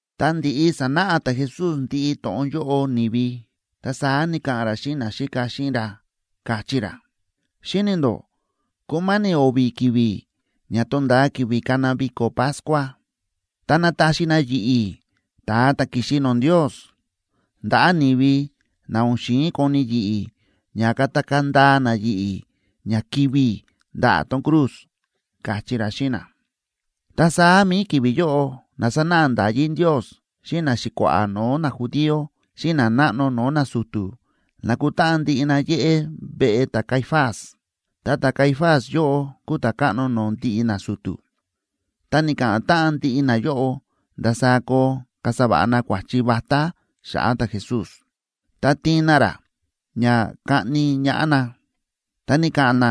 Ta ndi̱ꞌi sa̱náꞌa ta̱Jesús ndiꞌi to̱ꞌon yóꞌo ni̱vi, ta saá ni̱ka̱ꞌa̱n ra xíꞌin naxíka xíꞌin ra, káchí ra: ―Xíni̱ ndó kúma̱ni̱ o̱vi̱ ki̱vi̱ ña tonda̱a ki̱vi̱ kana viko̱ Pascua.a Ta nataxi na yi̱ꞌi̱, ta̱a ta̱ ki̱xi no̱o̱ Ndios, ndaꞌa̱ ni̱vi na o̱n xi̱in koni yi̱ꞌi̱ ña katakaa̱ ndaa na yi̱ꞌi̱ ña kivi̱ i̱ ndaꞌa̱ tón cruz ―káchí ra xíꞌin na. Ta saá mi̱i ki̱vi̱ yóꞌo na sánáꞌa nda̱yí Ndios xíꞌin naxi̱kua̱ꞌa̱ no̱o̱ najudío xíꞌin nanáꞌno no̱o̱ nasu̱tu̱, na̱kutáꞌan ndiꞌi na yéꞌé veꞌe ta̱Caifás, ta ta̱Caifás yóꞌo kúu ta̱káꞌno no̱o̱ ndiꞌi nasu̱tu̱. Ta ni̱ka̱ꞌa̱n táꞌan ndiꞌi nayóꞌo ndasaá koo kasa va̱ꞌa na kua̱chi vatá xa̱ꞌa̱ ta̱Jesús, ta tiin na ra ña kaꞌni ñaꞌá na. Ta ni̱ka̱ꞌa̱n na,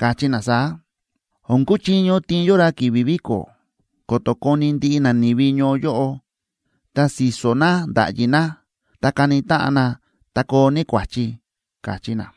káchí na saá: ―O̱n kuchiño tiin yó ra ki̱vi̱ viko̱, ko̱to̱ koni ndiꞌi nani̱vi ñoo yóꞌo, ta si̱so̱ na nda̱ꞌyi na, ta kani táꞌan na, ta koo ní kua̱chi ―káchí na.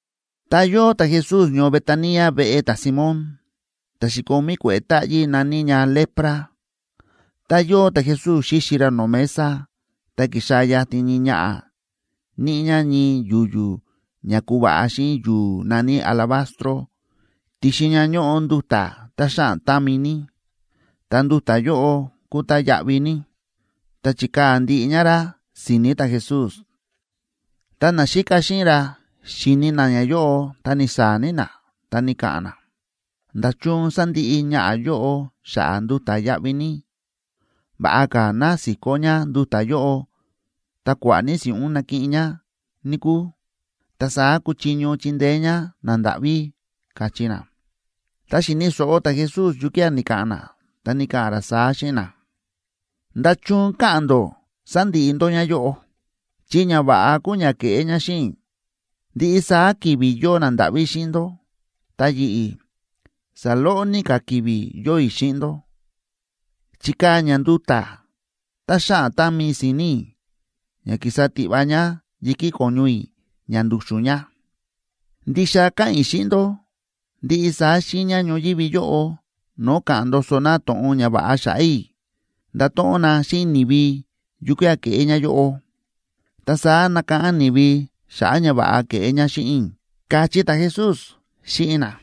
Ta yóo ta̱Jesús ñoo Betania veꞌe ta̱Simón, ta̱ xi̱komí kue̱ꞌe̱ táꞌyí na̱ní ña lepra. Tá yóo ta̱Jesús xíxi ra no̱o̱ mesa, ta ki̱xaa̱ yatin ñii ñaꞌa̱ níꞌi ñá ñii yu̱yu̱ ña ku̱va̱ꞌa xíꞌin yu̱u̱ na̱ní alabastro, ti̱xin ña ñóꞌo nduta̱ tá xáꞌan támi ní, ta nduta̱ yóꞌo kúu tá yáꞌví ní. Ta chi̱kaa̱ ndiꞌi ñá rá si̱ni̱ ta̱Jesús. Ta naxíka xíꞌin ra xi̱ni na ñayóꞌo ta ni̱saa̱ ní na, ta ni̱ka̱ꞌa̱n na: ―¿Nda̱chun sa̱ndiꞌi ñaꞌa̱ yóꞌo xa̱ꞌa̱ nduta̱ yáꞌví ní? Va̱ꞌa ka̱ ná si̱kó ñá nduta̱ yóꞌo ta kua̱ꞌa̱ ní si̱ꞌún nakiꞌin ñá, níkúu, ta saá kuchiño chindeé ñá nandáꞌví ―káchí na. Ta xi̱ni̱ so̱ꞌo ta̱Jesús yukía̱ ni̱ka̱ꞌa̱n na, ta ni̱ka̱ꞌa̱n ra saá xíꞌin na: ―¿Nda̱chun káꞌa̱n ndó sándiꞌi ndó ñáyóꞌo? Chi ñava̱ꞌa kúu ña ke̱ꞌé ñá xíꞌin i̱. Ndiꞌi saá ki̱vi̱ yóo nandáꞌví xíꞌin ndó. Ta yi̱ꞌi̱, saloꞌo ní ka̱ ki̱vi̱ yóo i̱ xíꞌin ndó. Chi̱kaa̱ ñá nduta̱ tá xáꞌan támi si̱ni̱ i̱ ña ki̱sa tiꞌva ñá yi̱kí ko̱ñu i̱ ña ndu̱xu̱n ña. Ndixa káꞌa̱n i̱ xíꞌin ndó, ndiꞌi saá xiiña ñoyívi yóꞌo no̱o̱ ka̱ꞌa̱n ndoso na to̱ꞌon ñava̱ꞌa xa̱ꞌa̱ i̱, ndato̱ꞌon na xíꞌin ni̱vi yukía̱ ke̱ꞌé ñáyóꞌo. Ta saá nakáꞌán ni̱vi xa̱ꞌa̱ ñava̱ꞌa ke̱ꞌé ñá xíꞌin i̱ ―káchí ta̱Jesús xíꞌin na.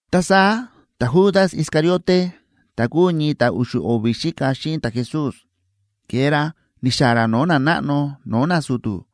Ta saá ta̱Judas Iscariote, ta̱ kúu ñii ta̱ u̱xu̱ o̱vi̱ xíka xíꞌin ta̱Jesús, ke̱e ra ni̱xa̱ꞌa̱n ra no̱o̱ nanáꞌno no̱o̱ nasu̱tu̱,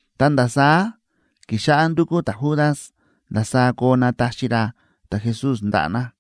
Ta nda̱ saá ki̱xáꞌá ndúkú ta̱Judas ndasaá koo nataxi ra ta̱Jesús ndaꞌa̱ na.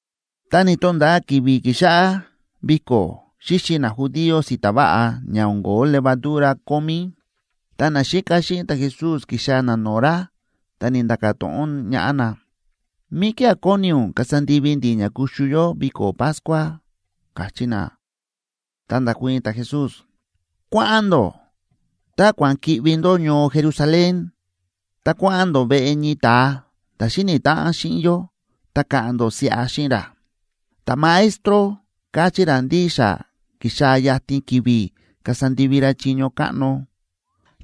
Ta ni̱to̱nda̱a ki̱vi̱ ki̱xáꞌá viko̱ xíxi najudío si̱ta̱ váꞌa ña o̱n ko̱ó levadura kómí,b ta naxíka xíꞌin ta̱Jesús ki̱xaa̱ na no̱o̱ ra, ta ni̱nda̱ka̱ to̱ꞌon ñaꞌá na: ―¿Míkía̱ kóni ún kasa ndivi ndi̱ ña kuxu yó viko̱ Pascua? ―káchí na. Ta nda̱kuii̱n ta̱Jesús: ―Kua̱ꞌa̱n ndó, ta kua̱ꞌa̱n ki̱ꞌvi ndó ñoo Jerusalén, ta kua̱ꞌa̱n ndó veꞌe ñii ta̱a ta̱ xíni̱ táꞌan xíꞌin yó, ta ka̱ꞌa̱n ndó siꞌa xíꞌin ra: “Ta̱Maestro káchí ra ndí xa kíxaa̱ yatin ki̱vi̱ kasa ndivi ra chiño káꞌno.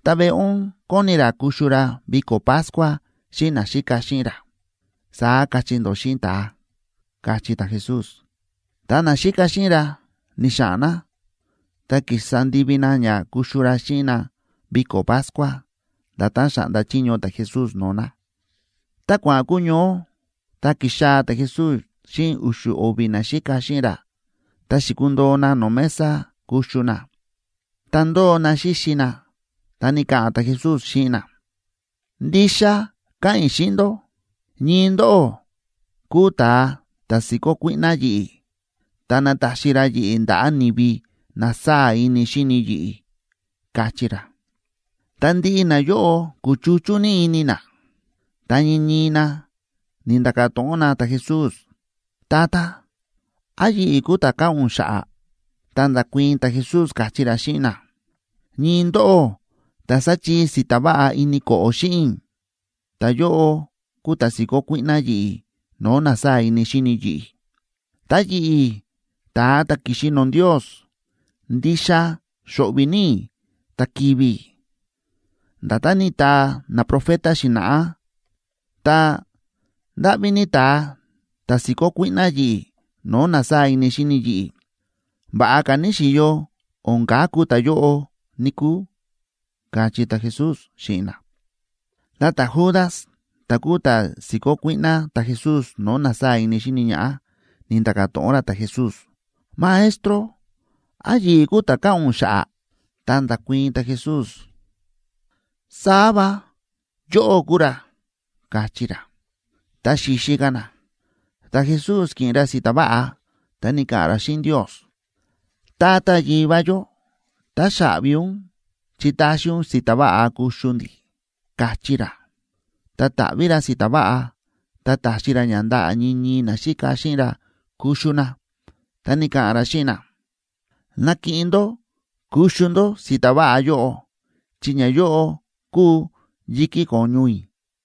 Ta veꞌe ún kóni ra kuxu ra viko̱ Pascua xíꞌin naxíka xíꞌin ra”, saá kachí ndó xíꞌin ta̱a ―káchí ta̱Jesús. Ta naxíka xíꞌin ra ni̱xa̱ꞌa̱n na, ta ki̱sa ndivi na ña kuxu ra xíꞌin na viko̱ Pascua, nda̱tán xa̱ꞌnda chiño ta̱Jesús no̱o̱ na. Ta kua̱ꞌa̱n kuñoó, ta ki̱xaa̱ ta̱Jesús xíꞌin u̱xu̱ o̱vi̱ naxíka xíꞌin ra, ta xi̱kundoo na no̱o̱ mesa kuxu na. Tá ndóo na xíxi na, ta ni̱ka̱ꞌa̱n ta̱Jesús xíꞌin na: ―Ndixa káꞌa̱n i̱ xíꞌin ndó, ñii ndóꞌó kúu ta̱a ta̱ si̱kó kuíꞌná yi̱ꞌi̱ ta nataxi ra yi̱ꞌi̱ ndaꞌa̱ ni̱vi na sáa̱ ini xíni yi̱ꞌi̱ ―káchí ra. Ta ndiꞌi nayóꞌo kúchuchú ní ini na, ta ñii ñii na ni̱nda̱ka̱ to̱ꞌon na ta̱Jesús: ―Tata, ¿án yi̱ꞌi̱ kúu ta̱ káꞌa̱n ún xa̱ꞌa̱? Ta nda̱kuii̱n ta̱Jesús, káchí ra xíꞌin na: ―Ñii ndóꞌó ta̱ sáchii si̱ta̱ váꞌa ini ko̱ꞌo̱ xíꞌin i̱, ta̱yóꞌo kúu ta̱ si̱kó kuíꞌná yi̱ꞌi̱ no̱o̱ na sáa̱ ini xíni yi̱ꞌi̱. Ta yi̱ꞌi̱, ta̱a ta̱ ki̱xi no̱o̱ Ndios, ndixa xo̱ꞌvi̱ ní i̱ ta kivi̱ i̱, nda̱tán ni̱taa naprofeta xi̱na̱ꞌá. Ta, ¡ndáꞌví ní ta̱a ta̱ si̱kó kuíꞌná yi̱ꞌi̱ no̱o̱ na sáa̱ ini xíni yi̱ꞌi̱! Va̱ꞌa ka̱ níxi̱yo o̱n kaku ta̱yóꞌo, níkúu ―káchí ta̱Jesús xíꞌin na. Ta ta̱Judas, ta̱ kúu ta̱ si̱kó kuíꞌná ta̱Jesús no̱o̱ na sáa̱ ini xíni ñaꞌá, ni̱nda̱ka̱ to̱ꞌon ra ta̱Jesús: ―Maestro, ¿án yi̱ꞌi̱ kúu ta̱ káꞌa̱n ún xa̱ꞌa̱? Ta nda̱kuii̱n ta̱Jesús: ―Saá va, yóꞌó kúu ra ―káchí ra. Tá xíxi ka̱ na, ta̱Jesús ki̱ꞌin ra si̱ta̱ váꞌa, ta ni̱ka̱ꞌa̱n ra xíꞌin Ndios: ―Tata Yivá yó, táxaꞌvi ún chi ta̱xi ún si̱ta̱ váꞌa kuxu ndi̱ ―káchí ra. Ta ta̱ꞌví ra si̱ta̱ váꞌa, ta ta̱xi ra ña ndaꞌa̱ ñii ñii naxíka xíꞌin ra kuxu na. Ta ni̱ka̱ꞌa̱n ra xíꞌin na: ―Nakiꞌin ndó kuxu ndó si̱ta̱ váꞌa yóꞌo, chi ñayóꞌo kúu yi̱kí ko̱ñu i̱.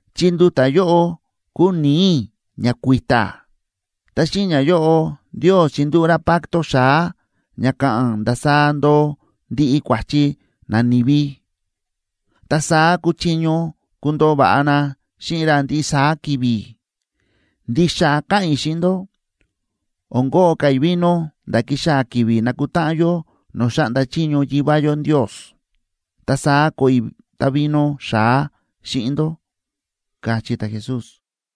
Chi nduta̱ yóꞌo kúu ni̱i̱ i̱ ña kui̱ta̱. Ta xíꞌin ñayóꞌo Ndios chindúꞌu̱ ra pacto xa̱á ña ka̱ꞌa̱n ndasaá ndoo ndiꞌi kua̱chi nani̱vi, ta saá kuchiño kundoo va̱ꞌa na xíꞌin ra ndiꞌi saá ki̱vi̱. Ndixa káꞌa̱n i̱ xíꞌin ndó, o̱n koꞌo ka̱ i̱ vino nda̱ kixaa̱ ki̱vi̱ nakutáꞌan yó no̱o̱ xáꞌnda chiño Yivá yó Ndios. Ta saá koꞌo i̱ távino xa̱á xíꞌin ndó ―káchí ta̱Jesús.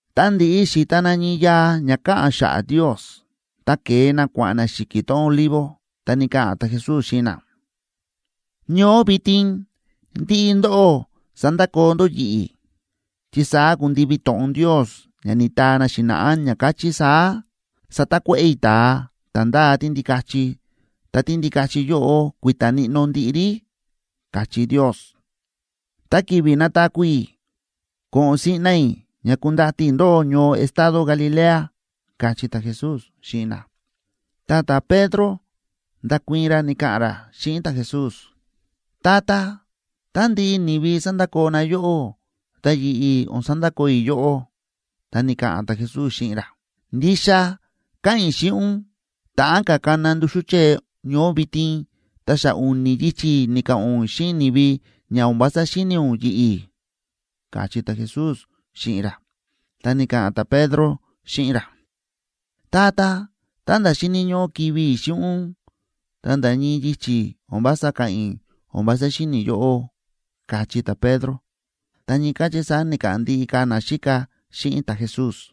Ta ndi̱ꞌi xi̱ta na ñii yaa ña káꞌa̱n xa̱ꞌa̱ Ndios, ta ke̱e na kua̱ꞌa̱n na xi̱ki̱ tón Olivo. Ta ni̱ka̱ꞌa̱n ta̱Jesús xíꞌin na: ―Ñoó vitin ndiꞌi ndóꞌó sandakoo ndó yi̱ꞌi̱, chi saá kundivi to̱ꞌon Ndios ña ni̱taa na xi̱na̱ꞌá, ña káchí saá: “Satakuéꞌe̱ i̱ ta̱a ta̱ ndáa tíndikachi, ta tíndikachi yóꞌo kui̱ta̱ níꞌnó ndiꞌi rí”, káchí Ndios. Ta ki̱vi̱ nataku̱ i̱, ko̱ꞌo̱n siꞌna i̱ ña kundati i̱ ndóꞌó ñoo estado Galilea ―káchí ta̱Jesús xíꞌin na. Ta ta̱Pedro nda̱kuii̱n ra, ni̱ka̱ꞌa̱n ra xíꞌin ta̱Jesús: ―Tata, tá ndiꞌi ni̱vi sandakoo na yóꞌó, ta yi̱ꞌi̱ o̱n sandakoo i̱ yóꞌó. Ta ni̱ka̱ꞌa̱n ta̱Jesús xíꞌin ra: ―Ndixa káꞌa̱n i̱ xíꞌin ún, ta̱ꞌán ka̱ kana nduxú chée ñoó vitin, ta xa u̱ni̱ yichi̱ ni̱ka̱ꞌa̱n ún xíꞌin ni̱vi ña o̱n vása xíni̱ ún yi̱ꞌi̱ ―káchí ta̱Jesús xíꞌin ra. Ta ni̱ka̱ꞌa̱n ta̱Pedro xíꞌin ra: ―Tata, ta̱nda̱ xíni̱ ñóꞌó kivi̱ i̱ xíꞌin ún, ta nda̱ ñii yichi̱ o̱n vása ka̱ꞌa̱n i̱ o̱n vása xíni̱ i̱ yóꞌó ―káchí ta̱Pedro. Ta ñii káchí saá ni̱ka̱ꞌa̱n ndiꞌi ka̱ naxíka xíꞌin ta̱Jesús.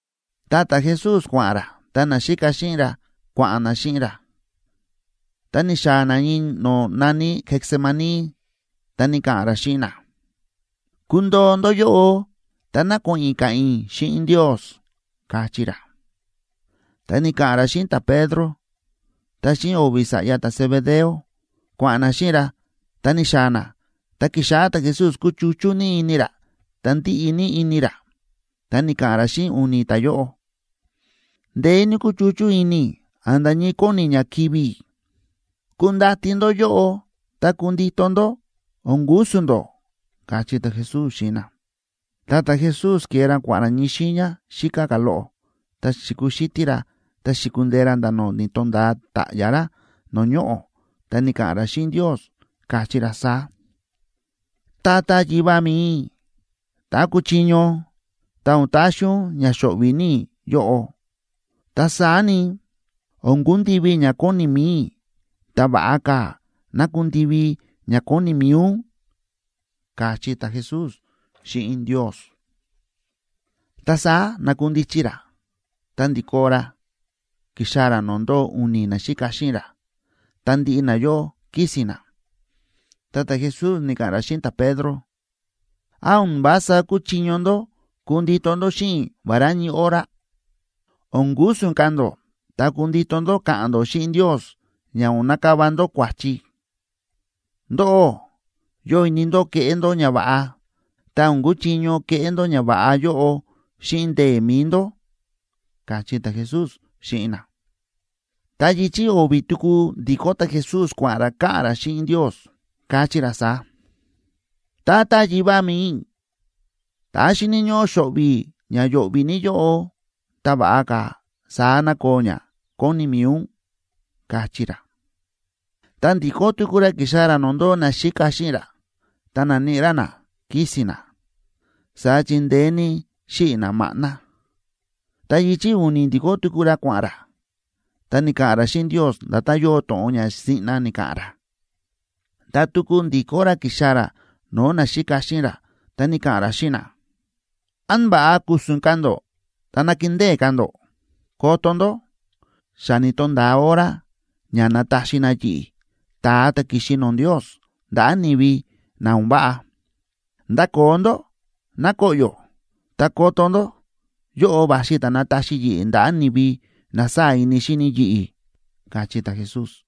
Ta ta̱Jesús kua̱ꞌa̱n ra, ta naxíka xíꞌin ra kua̱ꞌa̱n na xíꞌin ra, ta ni̱xaa̱ na ñii no̱o̱ na̱ní Getsemaní, ta ni̱ka̱ꞌa̱n ra xíꞌin na: ―Kundoo ndó yóꞌo ta ná ko̱ꞌo̱n i̱ ka̱ꞌa̱n i̱ xíꞌin Ndios ―káchí ra. Ta ni̱ka̱ꞌa̱n ra xíꞌin ta̱Pedro, ta xíꞌin o̱vi̱ sa̱ꞌya ta̱Zebedeo, kua̱ꞌa̱n na xíꞌin ra ta ni̱xaa̱ na, ta ki̱xáꞌá ta̱Jesús kúchuchú ní ini ra ta ndíꞌi ní ini ra. Ta ni̱ka̱ꞌa̱n ra xíꞌin u̱ni̱ ta̱yóꞌo: ―Ndeé ní kúchuchú ini i̱ a̱nda̱ ñii kóni ña kivi̱ i̱. Kundati ndó yóꞌo ta kundito ndó, o̱n ku̱su̱n ndó ―káchí ta̱Jesús xíꞌin na. Ta ta̱Jesús ke̱e ra kua̱ꞌa̱n ra ñii xiiña xíká ka̱ loꞌo, ta xi̱kuxítí ra ta xi̱kundee ra nda̱ ni̱to̱nda̱a ta̱ꞌya̱ ra no̱o̱ ñoꞌo̱, ta ni̱ka̱ꞌa̱n ra xíꞌin Ndios, káchí ra saá: ―Tata Yivá mi̱i i̱, tá kuchiño, ta o̱n taxi ún ña xo̱ꞌvi̱ ní i̱ yóꞌo. Ta saá ni, o̱n kundivi ña kóni mi̱i i̱, ta va̱ꞌa ka̱ ná kundivi ña kóni mi̱i ún ―káchí ta̱Jesús xíꞌin Ndios. Ta saá na̱kundichi ra ta ndi̱kó ra ki̱xaa̱ ra no̱o̱ ndóo u̱ni̱ naxíka xíꞌin ra. Ta ndiꞌi nayóꞌo kísi̱n na. Ta ta̱Jesús ni̱ka̱ꞌa̱n ra xíꞌin ta̱Pedro: ―¿Án o̱n vása kúchiño ndó kundito ndó xíꞌin i̱ vará ñii hora? O̱n ku̱su̱n ka̱ ndó ta kundito ndó ka̱ꞌa̱n ndó xíꞌin Ndios ña o̱n nakava ndó kua̱chi. Ndóꞌó yóo ini ndó keꞌé ndó ñava̱ꞌa, ta o̱n kúchiño keꞌé ndó ñava̱ꞌa yóꞌo xíꞌin ndee̱ mi̱i ndó ―káchí ta̱Jesús xíꞌin na. Ta yichi̱ o̱vi̱ tuku ndi̱kó ta̱Jesús kua̱ꞌa̱n ra ka̱ꞌa̱n ra xíꞌin Ndios, káchí ra saá: ―Tata Yivá mi̱i i̱, tá xíni̱ ñóꞌó xo̱ꞌvi̱ i̱ ña yo̱ꞌvi̱ ní yóꞌo, ta va̱ꞌa ka̱ saá ná koo ña kóni mi̱i ún ―káchí ra. Ta ndi̱kó tuku ra ki̱xaa̱ ra no̱o̱ ndóo naxíka xíꞌin ra, ta na̱níꞌi ra na kísi̱n na, saá chi ndeé ní xíꞌi̱ na maꞌná. Ta yichi̱ u̱ni̱ ndi̱kó tuku ra kua̱ꞌa̱n ra, ta ni̱ka̱ꞌa̱n ra xíꞌin Ndios nda̱tán yóo to̱ꞌon ña siꞌna ni̱ka̱ꞌa̱n ra. Ta tuku ndi̱kó ra ki̱xaa̱ ra no̱o̱ naxíka xíꞌin ra, ta ni̱ka̱ꞌa̱n ra xíꞌin na: ―¿Án va̱ꞌa ku̱su̱n ka̱ ndó ta nakindée ka̱ ndó? Koto ndó, xa ni̱to̱nda̱a hora ña nataxi na yi̱ꞌi̱, ta̱a ta̱ ki̱xi no̱o̱ Ndios, ndaꞌa̱ ni̱vi na o̱n váꞌa. Ndakoo ndó, ná koꞌyo̱. Ta koto ndó, yóꞌo va̱xi ta̱ nataxi yi̱ꞌi̱ ndaꞌa̱ nani̱vi na sáa̱ ini xíni yi̱ꞌi̱ ―káchí ta̱Jesús.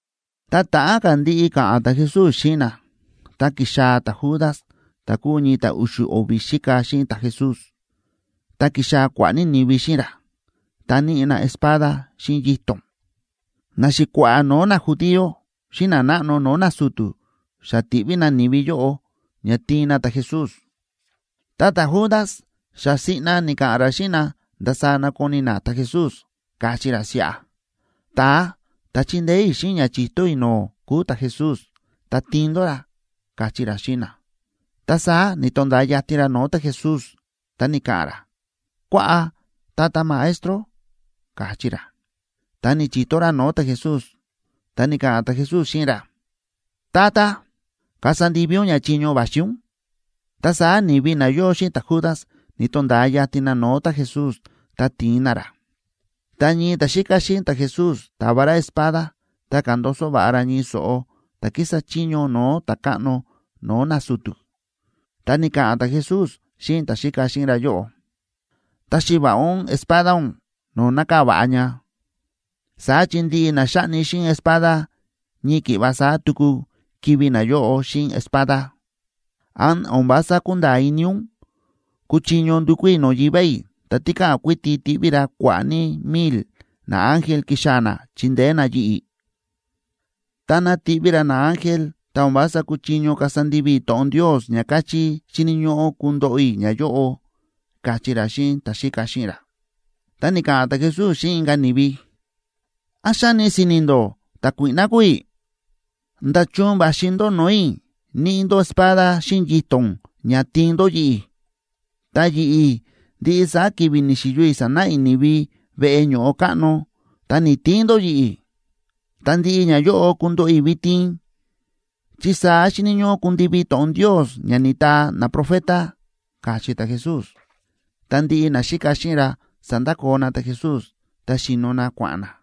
Tá ta̱ꞌán ka̱ ndiꞌi ka̱ꞌa̱n ta̱Jesús xíꞌin na, ta ki̱xaa̱ ta̱Judas ta̱ kúu ñii ta̱ u̱xu̱ o̱vi̱ xíka xíꞌin ta̱Jesús. Ta ki̱xaa̱ kua̱ꞌa̱ ní ni̱vi xíꞌin ra, ta níꞌi na espada xíꞌin yito̱n. Naxi̱kua̱ꞌa̱ no̱o̱ najudío xíꞌin nanáꞌno no̱o̱ nasu̱tu̱ xa ti̱ꞌví na ni̱vi yóꞌo ña tiin na ta̱Jesús. Ta ta̱Judas xa siꞌna ni̱ka̱ꞌa̱n ra xíꞌin na ndasaá nakoni na ta̱Jesús, káchí ra siꞌa: ―Ta̱a ta̱ chindeé i̱ xíꞌin ña chi̱to i̱ no̱o̱ kúu ta̱Jesús. Ta tiin ndó ra ―káchí ra xíꞌin na. Ta saá ni̱to̱nda̱a yatin ra no̱o̱ ta̱Jesús, ta ni̱ka̱ꞌa̱n ra: ―Kuaꞌa, Tata Maestro ―káchí ra. Ta ni̱chi̱to ra no̱o̱ ta̱Jesús. Ta ni̱ka̱ꞌa̱n ta̱Jesús xíꞌin ra: ―Tata, kasa ndivi ún ña chiño va̱xi ún. Ta saá ni̱vi na yóo xíꞌin ta̱Judas ni̱to̱nda̱a yatin na no̱o̱ ta̱Jesús ta ti̱in na ra. Ta ñii ta̱xíka xíꞌin ta̱Jesús ta̱va ra espada, ta ka̱ndoso va̱ꞌa ra ñii so̱ꞌo ta̱ kísa chiño no̱o̱ ta̱káꞌno no̱o̱ nasu̱tu̱. Ta ni̱ka̱ꞌa̱n ta̱Jesús xíꞌin ta̱xíka xíꞌin ra yóꞌo: ―Taxi va̱ꞌa ún espada ún no̱o̱ nákaa̱ va̱ꞌa ña, saá chi ndiꞌi na xáꞌni xíꞌin espada ñii ki̱ꞌva saá tuku kivi̱ nayóꞌo xíꞌin espada. ¿Án o̱n vása kúnda̱a̱ ini ún kúchiño ndukú i̱ no̱o̱ Yivá i̱ ta tikáꞌan kuiti tiꞌví ra kua̱ꞌa̱ ní milc naángel kixaa̱ na chindeé na yi̱ꞌi̱? Táná tiꞌví ra naángel, ta o̱n vása kuchiño kasa ndivi i̱ to̱ꞌon Ndios ña káchí xíni̱ ñóꞌó kundoꞌo i̱ ñayóꞌo ―káchí ra xíꞌin ta̱xíka xíꞌin ra. Ta ni̱ka̱ꞌa̱n ta̱Jesús xíꞌin inka̱ ni̱vi: ―¿Án xáni si̱ni̱ ndó ta̱kuíꞌná kúu i̱? ¿Nda̱chun va̱xi ndó no̱o̱ i̱ níꞌi ndó espada xíꞌin yito̱n ña tiin ndó yi̱ꞌi̱? Ta yi̱ꞌi̱, ndiꞌi saá ki̱vi̱ ni̱xi̱yo i̱ sánáꞌa i̱ ni̱vi veꞌe ño̱ꞌo káꞌno, ta ni̱‑tiin ndó yi̱ꞌi̱. Ta ndiꞌi ñayóꞌo kundoꞌo i̱ vitin, chi saá xíni̱ ñóꞌó kundivi to̱ꞌon Ndios ña ni̱taa naprofeta ―káchí ta̱Jesús. Ta ndiꞌi naxíka xíꞌin ra sa̱ndakoo na ta̱Jesús, ta xíno na kua̱ꞌa̱n na.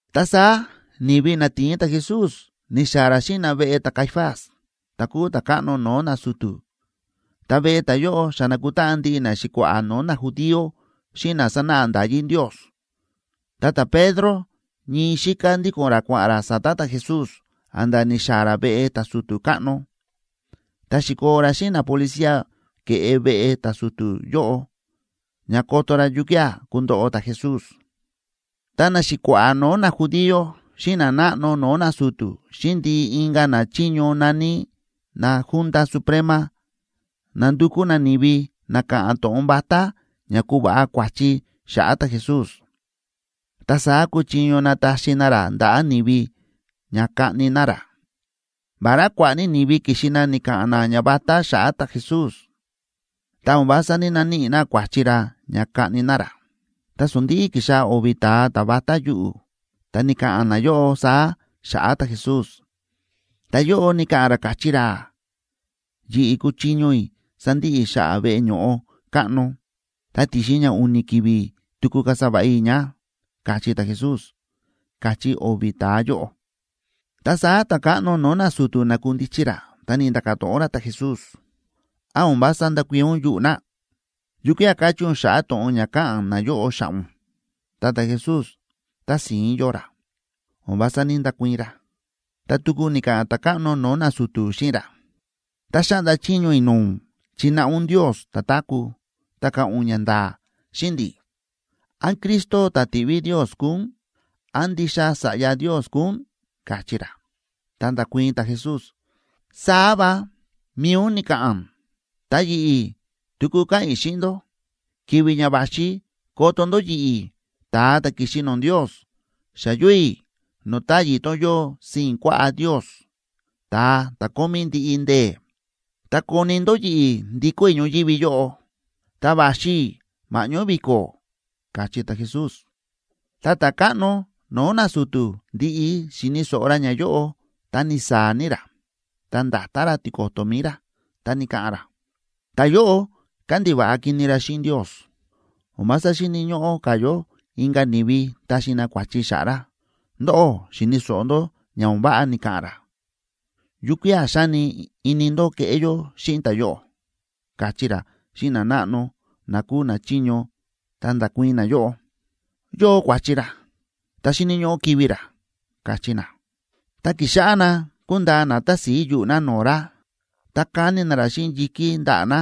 Ta saá ni̱vi na ti̱in ta̱Jesús, ni̱xaa̱ ra xíꞌin na veꞌe ta̱Caifás, ta̱ kúu ta̱káꞌno no̱o̱ nasu̱tu̱. Ta veꞌe ta̱yóꞌo xa na̱kutáꞌan ndiꞌi naxi̱kua̱ꞌa̱ no̱o̱ najudío xíꞌin na sánáꞌa nda̱yí Ndios. Ta ta̱Pedro ñii xíká ndíko̱n ra kua̱ꞌa̱n ra sa̱ta̱ ta̱Jesús a̱nda̱ ni̱xaa̱ ra veꞌe ta̱su̱tu̱ káꞌno. Ta xi̱koo ra xíꞌin napolicía ke̱ꞌe veꞌe ta̱su̱tu̱ yóꞌo ña koto ra yukía̱ kundoꞌo ta̱Jesús. Ta naxi̱kua̱ꞌa̱ no̱o̱ najudío xíꞌin nanáꞌno no̱o̱ nasu̱tu̱ xíꞌin ndiꞌi inka̱ nachiño na̱ní na Junta Suprema nándukú na ni̱vi na ka̱ꞌa̱n to̱ꞌon vatá ña kuva̱ꞌa kua̱chi xa̱ꞌa̱ ta̱Jesús, ta saá kuchiño nataxi na ra ndaꞌa̱ ni̱vi ña kaꞌni na ra. Vará kua̱ꞌa̱ ní ni̱vi ki̱xi na ni̱ka̱ꞌa̱n na ñavatá xa̱ꞌa̱ ta̱Jesús, ta o̱n vása ní‑naníꞌi na kua̱chi ra ña kaꞌni na ra. Ta sondi̱ꞌi ki̱xaa̱ o̱vi̱ ta̱a ta̱ vatá yuꞌu̱, ta ni̱ka̱ꞌa̱n nayóꞌo saá xa̱ꞌa̱ ta̱Jesús: ―Ta̱yóꞌo ni̱ka̱ꞌa̱n ra, káchí ra: “Yi̱ꞌi̱ kúchiño i̱ sandiꞌi i̱ xa̱ꞌa̱ veꞌe ño̱ꞌo káꞌno, ta ti̱xin ña u̱ni̱ ki̱vi̱ tuku kasa va̱ꞌa i̱ ña”, káchí ta̱Jesús ―káchí o̱vi̱ ta̱a yóꞌo. Ta saá ta̱káꞌno no̱o̱ nasu̱tu̱ na̱kundichi ra, ta ni̱nda̱ka̱ to̱ꞌon ra ta̱Jesús: ―¿Án o̱n vása ndákuii̱n ún yuꞌu̱ na? ¿Yukía̱ kachí ún xa̱ꞌa̱ to̱ꞌon ña káꞌa̱n nayóꞌo xa̱ꞌa̱ ún? Ta ta̱Jesús tási̱ín yóo ra, o̱n vása ní‑ndakuii̱n ra. Ta tuku ni̱ka̱ꞌa̱n ta̱káꞌno no̱o̱ nasu̱tu̱ xíꞌin ra: ―Ta xáꞌnda chiño i̱ no̱o̱ ún chináꞌa ún Ndios ta̱táku̱, ta ka̱ꞌa̱n ún ñanda̱a̱ xíꞌin ndi̱, ¿án Cristo ta̱ ti̱ꞌví Ndios kúu ún? ¿Án ndixa Sa̱ꞌya Ndios kúu ún? ―káchí ra. Ta nda̱kuii̱n ta̱Jesús: ―Saá va, mi̱i ún ni̱ka̱ꞌa̱n. Ta yi̱ꞌi̱ tuku káꞌa̱n i̱ xíꞌin ndó, ki̱vi̱ ña va̱xi koto ndó yi̱ꞌi̱, ta̱a ta̱ ki̱xi no̱o̱ Ndios, xa yóo i̱ no̱o̱ táyi̱ tón yóo sii̱n kuaꞌá Ndios, ta̱a ta̱ kómí ndiꞌi ndee̱. Ta koni ndó yi̱ꞌi̱ ndikó i̱ ñoyívi yóꞌo, ta va̱xi i̱ ma̱ꞌñó vi̱ko̱ ―káchí ta̱Jesús. Ta ta̱káꞌno no̱o̱ nasu̱tu̱ ndi̱ꞌi xi̱ni̱ so̱ꞌo ra ñayóꞌo, ta ni̱saa̱ ní ra, ta nda̱ta ra tiko̱to̱ mi̱i ra, ta ni̱ka̱ꞌa̱n ra: ―¡Ta̱yóꞌo kándiva̱ꞌa kini ra xíꞌin Ndios! O̱n vása xíni̱ ñóꞌó ka̱ yó inka̱ ni̱vi taxi na kua̱chi xa̱ꞌa̱ ra. Ndóꞌó xi̱ni̱ so̱ꞌo ndó ña o̱n váꞌa ni̱ka̱ꞌa̱n ra. ¿Yukía̱ xáni ini ndó keꞌé yó xíꞌin ta̱yóꞌo? ―káchí ra xíꞌin nanáꞌno na kúu nachiño. Ta nda̱kuii̱n nayóꞌo: ―Yóo kua̱chi ra. Ta xíni̱ ñóꞌó kivi̱ ra ―káchí na. Ta ki̱xáꞌá na kúndaa na tási̱i yuꞌu̱ na no̱o̱ ra, ta káni na ra xíꞌin yi̱kí ndaꞌa̱ na,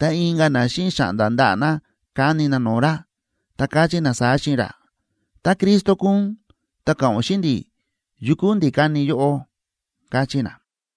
ta inka̱ na xíꞌin xa̱ꞌnda̱ ndaꞌa̱ na káni na no̱o̱ ra, ta káchí na saá xíꞌin ra: ―Tá Cristo kúu ún, ta ka̱ꞌa̱n ún xíꞌin ndi̱, ¿yukú ndi̱ ka̱ni yóꞌó? ―káchí na.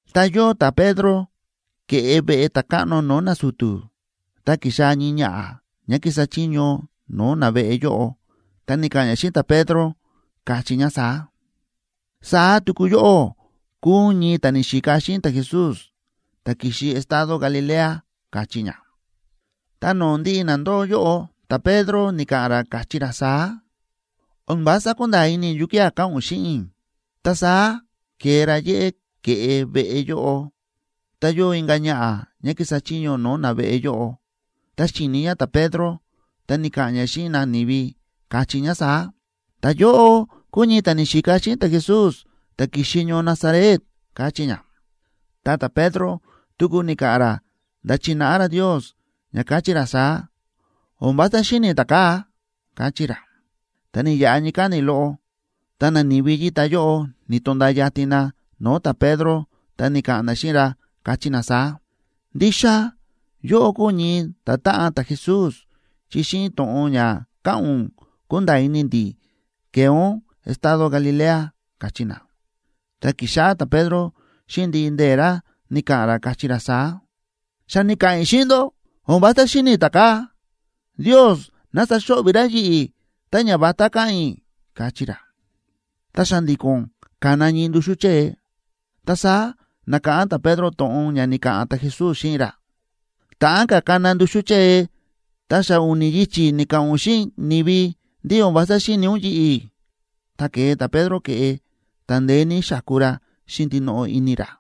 Ta yóo ta̱Pedro ke̱ꞌe veꞌe ta̱káꞌno no̱o̱ nasu̱tu̱, ta ki̱xaa̱ ñii ñaꞌa̱ ñá kísa chiño no̱o̱ naveꞌe yóꞌo, ta ni̱ka̱ꞌa̱n ñá xíꞌin ta̱Pedro, káchí ñá saá: ―Saá tuku yóꞌó kúu ún ñii ta̱ ni̱xika xíꞌin ta̱Jesús, ta̱ ki̱xi estado Galilea ―káchí ñá. Ta no̱o̱ ndiꞌi na ndóo yóꞌo ta̱Pedro ni̱ka̱ꞌa̱n ra, káchí ra saá: ―O̱n vása kúnda̱a̱ ini i̱ yukía̱ káꞌa̱n ún xíꞌin i̱. Ta saá ke̱e ra yéꞌé ke̱ꞌe veꞌe yóꞌo, ta yóo inka̱ ñaꞌa̱ ñá kísa chiño no̱o̱ naveꞌe yóꞌo, ta xíni ñá ta̱Pedro, ta ni̱ka̱ꞌa̱n ñá xíꞌin nani̱vi, káchí ñá saá: ―Ta̱yóꞌo kúu ñii ta̱ ni̱xika xíꞌin ta̱Jesús, ta̱ ki̱xi ñoo Nazaret ―káchí ñá. Ta ta̱Pedro tuku ni̱ka̱ꞌa̱n ra nda̱ chi̱náꞌa ra Ndios ña káchí ra saá: ―O̱n vása xíni̱ i̱ ta̱kaa̱ ―káchí ra. Ta ni̱yaꞌa ñii káni̱ loꞌo, ta nani̱vi yíta yóꞌo ni̱to̱nda̱a yatin na no̱o̱ ta̱Pedro, ta ni̱ka̱ꞌa̱n na xíꞌin ra, káchí na saá: ―Ndixa yóꞌó kúu ún ñii ta̱táꞌan ta̱Jesús, chi xíꞌin to̱ꞌon ña káꞌa̱n ún kúnda̱a̱ ini ndi̱ ke̱e ún estado Galilea ―káchí na. Ta ki̱xáꞌá ta̱Pedro xíꞌin ndiꞌi ndee̱ ra ni̱ka̱ꞌa̱n ra, káchí ra saá: ―Xa ni̱ka̱ꞌa̱n i̱ xíꞌin ndó, o̱n vása xíni̱ i̱ ta̱kaa̱. ¡Ndios ná saxo̱ꞌvi̱ ra yi̱ꞌi̱ tá ñavatá káꞌa̱n i̱! ―káchí ra. Ta xa̱ndi̱ko̱n ka̱na ñii nduxú chée. Ta saá na̱káꞌán ta̱Pedro to̱ꞌon ña ni̱ka̱ꞌa̱n ta̱Jesús xíꞌin ra: “Ta̱ꞌán ka̱ kana ñii nduxú chée ta xa u̱ni̱ yichi̱ ni̱ka̱ꞌa̱n ún xíꞌin ni̱vi ndí o̱n vása xíni̱ ún yi̱ꞌi̱.” Ta ke̱e ta̱Pedro ke̱ꞌe, ta ndeé ní xáku ra xíꞌin ndinoꞌo ini ra.